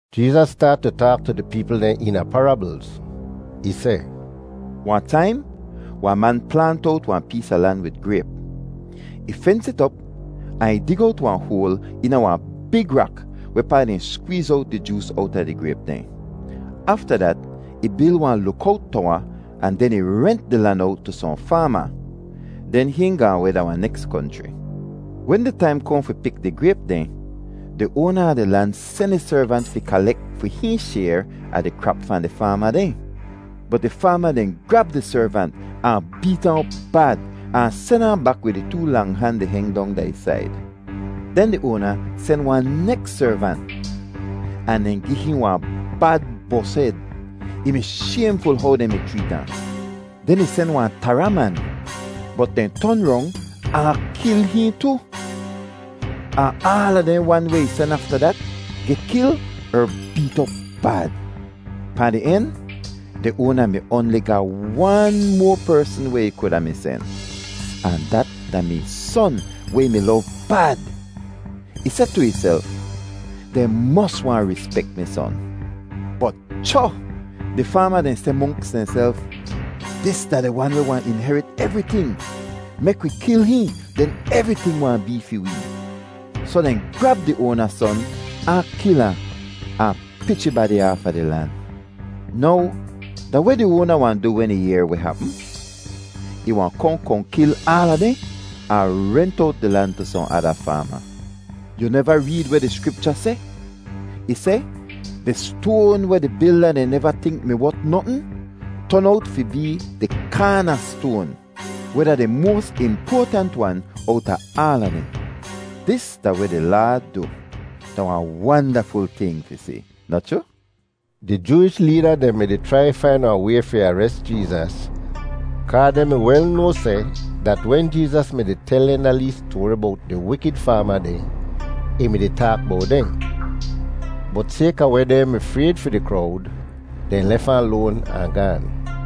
Jeezas staat tu taak tu di peepl dehn eena parablz. Ih seh, “Wahn taim wahn man plaant owt wahn pees a lan wid grayp. Ih fens it op ahn ih dig owt wahn hoal eena wahn big rak wehpaa dehn skweez owt di joos owta di grayp dehn. Afta dat ih bil wahn lukowt towa ahn den ih rent di lan owt tu sohn faama. Den hihn gaahn weh da wahn neks konchri. “Wen di taim kohn fi pik di grayp dehn, di oana a di lan sen ih servant fi kalek fi hihn shayr a di krap fahn di faama dehn. Bot di faama dehn grab di servant ahn beet ahn op bad, ahn sen ahn bak wid ih too lang han di heng dong da ih said. “Den di oana sen wahn neks servant, ahn dehn gi hihn wahn bad bos-hed; ih mi shaymful how dehn mi chreet ahn. Den ih sen wahn tara man, bot dehn ton rong ahn kil hihn tu. Ahn aala dehn wan weh ih sen afta dat geh kil er beet op bad. “Pahn di en, di oana mi oanli ga wan moa persn weh ih kuda mi sen, ahn dat da-mi ih son weh ih mi lov bad. Ih seh tu ihself, ‘Dehn mos wahn rispek mi son.’ “Bot cho! Di faama dehn seh monks dehnself, ‘Dis da di wan weh wahn inherit evriting. Mek wi kil hihn, den evriting wahn bee fi wee!’ Soh dehn grab di oana son ahn kil ahn, ahn pich ih badi aafa di lan. “Now da weh di oana wahn du wen ih yehr weh hapm? Ih wahn kohn kohn kil aala dehn, ahn rent owt di lan tu sohn ada faama. Yu neva reed weh di Skripcha seh? Ih seh, ‘Di stoan weh di bilda dehn neva tink mi wot notn ton owt fi bee di kaanastoan, weh da di moas impoatant wan owta aala dehn. Dis da weh di Laad du. Da wahn wandaful ting fi si, noh chroo’?” Di Jooish leeda dehn mi-di chrai fain wahn way fi ares Jeezas kaa dehn mi wel noa seh dat wen Jeezas mi-di tel dehn da lee stoari bowt di wikid faama dehn, ih mi-di taak bowt dehn. Bot sayka weh dehn mi frayd fi di krowd, dehn lef ahn loan ahn gaan.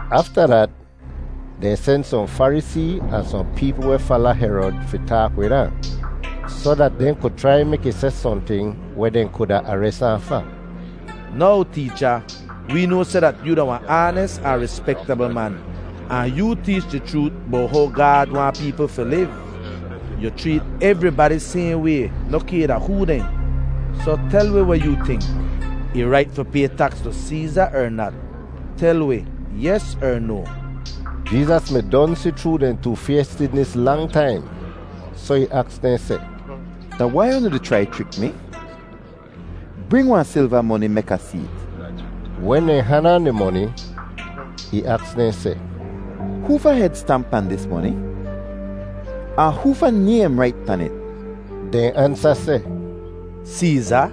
Afta dat dehn sen sohn Farisee ahn sohn peepl weh fala Herod fi taak wid ahn soh dat dehn ku chrai mek ih seh sohnting weh dehn kuda ares ahn fa. “Now Teecha, wee noa seh dat yoo da wahn aanis ahn rispektabl man, ahn yoo teech di chroot bowt how Gaad waahn peepl fi liv. Yu chreet evribadi sayhn way noh kay da hoo dehn. Soh tel wi weh yoo tink. Ih rait fi pay taks tu Seeza er nat? Tel wi, yes er no?” Jeezas mi don si chroo dehn toofaystidnis lang taim, soh ih aks dehn seh, “Da wai unu di chrai chrik mi? Bring wahn silva moni, mek Ah see't.” Wen dehn han ahn di moni, ih aks dehn seh, “Hoofa hed stamp pahn dis moni, ahn hoofa naym rait pan it?” Dehn ansa seh, “Seeza.”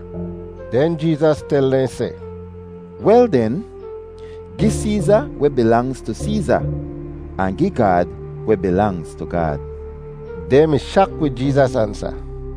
Den Jeezas tel dehn seh, “Wel den, gi Seeza weh bilangz tu Seeza, ahn gi Gaad weh bilangz tu Gaad!” Dehn mi shak wid Jeezas ansa.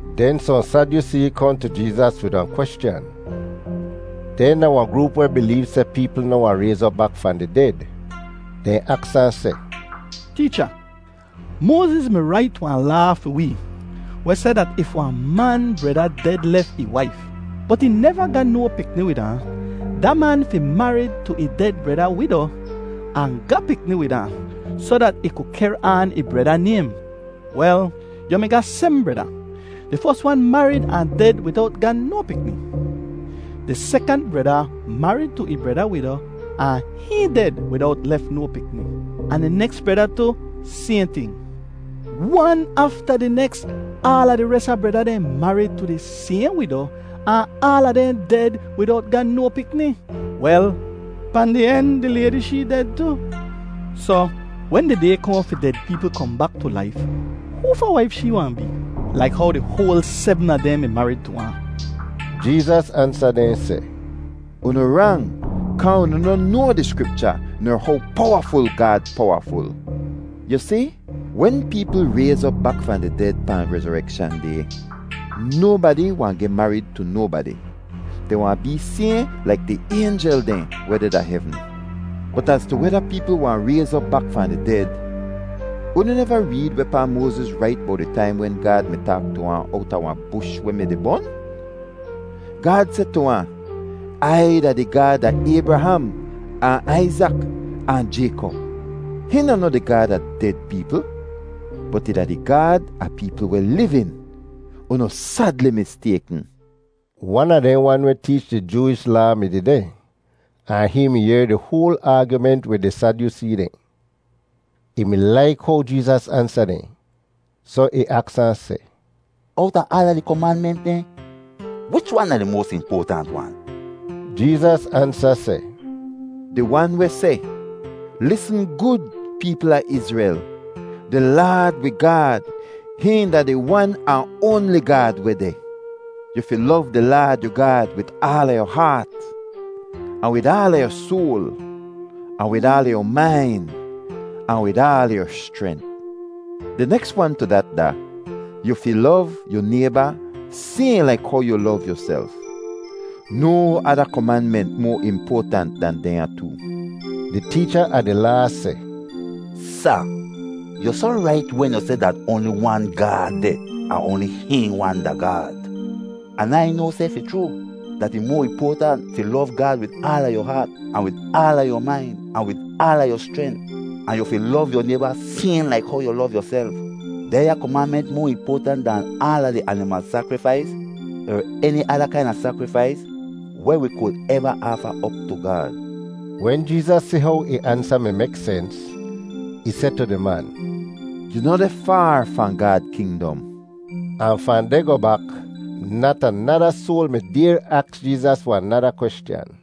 Den sohn Sadyusee kohn tu Jeezas wid wahn kweschan. Dehn da wahn groop weh bileev seh peepl noh wahn rayz op bak fahn di ded. Dehn aks ahn seh, “Teecha, Moaziz mi rait wahn laa fi wi weh seh dat if wahn man breda ded lef ih waif, bot ih neva ga no pikni wid ahn, da man fi marid tu ih ded breda wido ahn ga pikni wid ahn soh dat ih ku kehr aan ih breda naym. Wel, yu mi ga sebm breda. Di fos wan marid ahn ded widowt ga no pikni. Di sekant breda marid tu ih breda wido, ahn hihn ded widowt lef no pikni. Ahn di neks breda tu, sayhn ting. Wan afta di neks aala di res a breda dehn marid tu di sayhn wido ahn aala dehn ded widowt ga no pikni. Wel, pahn di en di laydi shee ded tu. Soh, wen di day kohn fi ded peepl kohn bak tu laif, hoofa waif shee wahn bee, laik how di hoal sebm a dehn mi marid tu ahn?” Jeezas ansa dehn seh, “Unu rang kaa unu noh noa di Skripcha ner how powaful Gaad powaful. Yu si, wen peepl rayz op bak fahn di ded pahn rezorekshan day, nobadi wahn geh marid tu nobadi. Dehn wahn bee sayhn laik di aynjel dehn weh deh da hevn. Bot az tu weda peepl wahn rayz op bak fahn di ded, unu neva reed wehpaa Moaziz rait bowt di taim wen Gaad mi taak tu ahn owta wahn bush weh mi-di bon? Gaad seh tu ahn, ‘Ai da di Gaad a Aybraham ahn Aizak, ahn Jaykop.’ Hihn da noh di Gaad a ded peepl, bot ih da di Gaad a peepl weh livin. Unu sadli mistaykn.” Wan a dehn wan weh teech di Jooish Laa mi dehdeh ahn hihn mi yehr di hoal aagyument wid di Sadyusee dehn. Ih mi laik how Jeezas ansa dehn, soh ih aks ahn seh, “Owta aala di komanment dehn, wich wan da di moas impoatant wan?” Jeezas ansa seh, “Di wan weh seh, ‘Lisn gud, peepl a Izrel! Di Laad wi Gaad, hihn da di Wan ahn oanli Gaad weh deh. Yu fi lov di Laad yu Gaad wid aala yu haat, ahn wid aala yu soal, ahn wid aala yu main, ahn wid aala yu schrent.’ Di neks wan tu dat da: ‘Yu fi lov yu nayba sayhn laik how yu lov yuself.’ No ada komanment moa impoatant dan dehnya too.” Di teecha a di Laa seh, “Sa, yu soh rait wen yu seh dat oanli wan Gaad deh ahn oanli hihn wan da Gaad. An Ai noa seh fi chroo dat ih moa impoatant fi lov Gaad wid aala yu haat, ahn wid aala yu main, ahn wid aala yu schrent, ahn yu fi lov yu nayba sayhn laik how yu lov yuself. Dehnya komanment moa impoatant dahn aala di animal sakrifais er eni ada kaina sakrifais weh wi ku eva aafa op tu Gaad.” Wen Jeezas si how ih ansa mi mek sens, ih seh tu di man, “Yu noh deh faar fahn Gaad kingdom.” Ahn fahn deh goh bak nat anada soal mi dayr aks Jeezas wahn nada kweschan.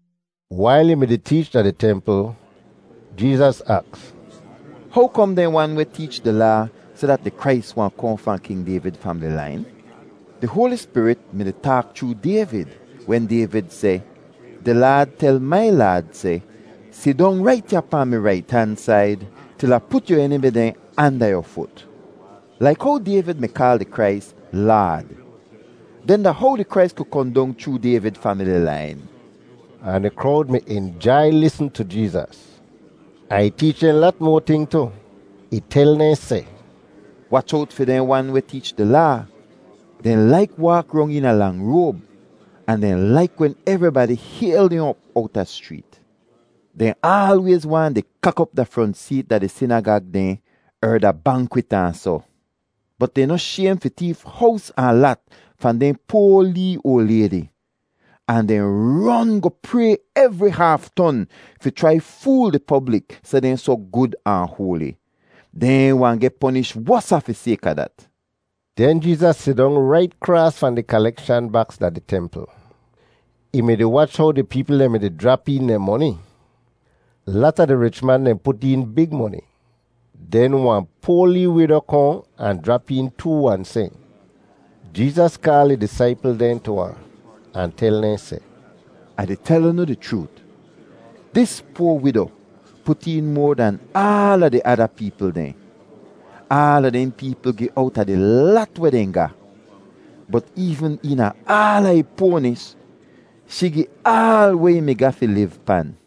Wail ih mi-di teech da di templ, Jeezas aks, “How kom dehn wan weh teech di Laa seh dat di Krais wahn kohn fahn King Dayvid famili lain? Di Hoali Spirit mi-di taak chroo Dayvid wen Dayvid seh, ‘Di Laad tel mai Laad seh, “Sidong rait ya pahn mi rait han said til Ah put yu enimi dehn anda yu fut.” ’ Laik how Dayvid mi kaal di Krais ‘Laad,’ den da how di Krais ku kohn dong chroo Dayvid famili lain?” Ahn di krowd mi injai lisn tu Jeezas. Ahn ih teech dehn lat moa ting tu. Ih tel dehn seh, “Wach owt fi dehn wan weh teech di Laa! Dehn laik waak rong eena lang roab, ahn dehn laik wen evribadi hayl dehn op owta schreet. Dehn aalwayz waahn di kak op da front seet da di sinagag dehn er da bankwit ahn soh. Bot dehn noh shaym fi teef hows ahn lat fahn dehn poa lee oal laydi, ahn dehn ron goh pray evri haaf ton fi chrai fool di poblik seh dehn soh gud ahn hoali. Dehn wahn geh ponish wosa fi sayka dat.” Den Jeezas sidong rait kraas fahn di kalekshan baks da di templ. Ih mi-di wach how di peepl dehn mi-di jrap een dehn moni. Lata di rich man dehn put een big moni. Den wahn poa lee wido kohn ahn jrap een too wan sehn. Jeezas kaal ih disaipl dehn tu ahn, ahn tel dehn seh, “Ah di tel unu di chroot, dis poa wido put een moa dahn aala di ada peepl dehn. Aala dehn peepl gi owta di lat weh dehn ga. Bot eevn eena aala ih poanis, shee gi aal weh ih mi ga fi liv pan.”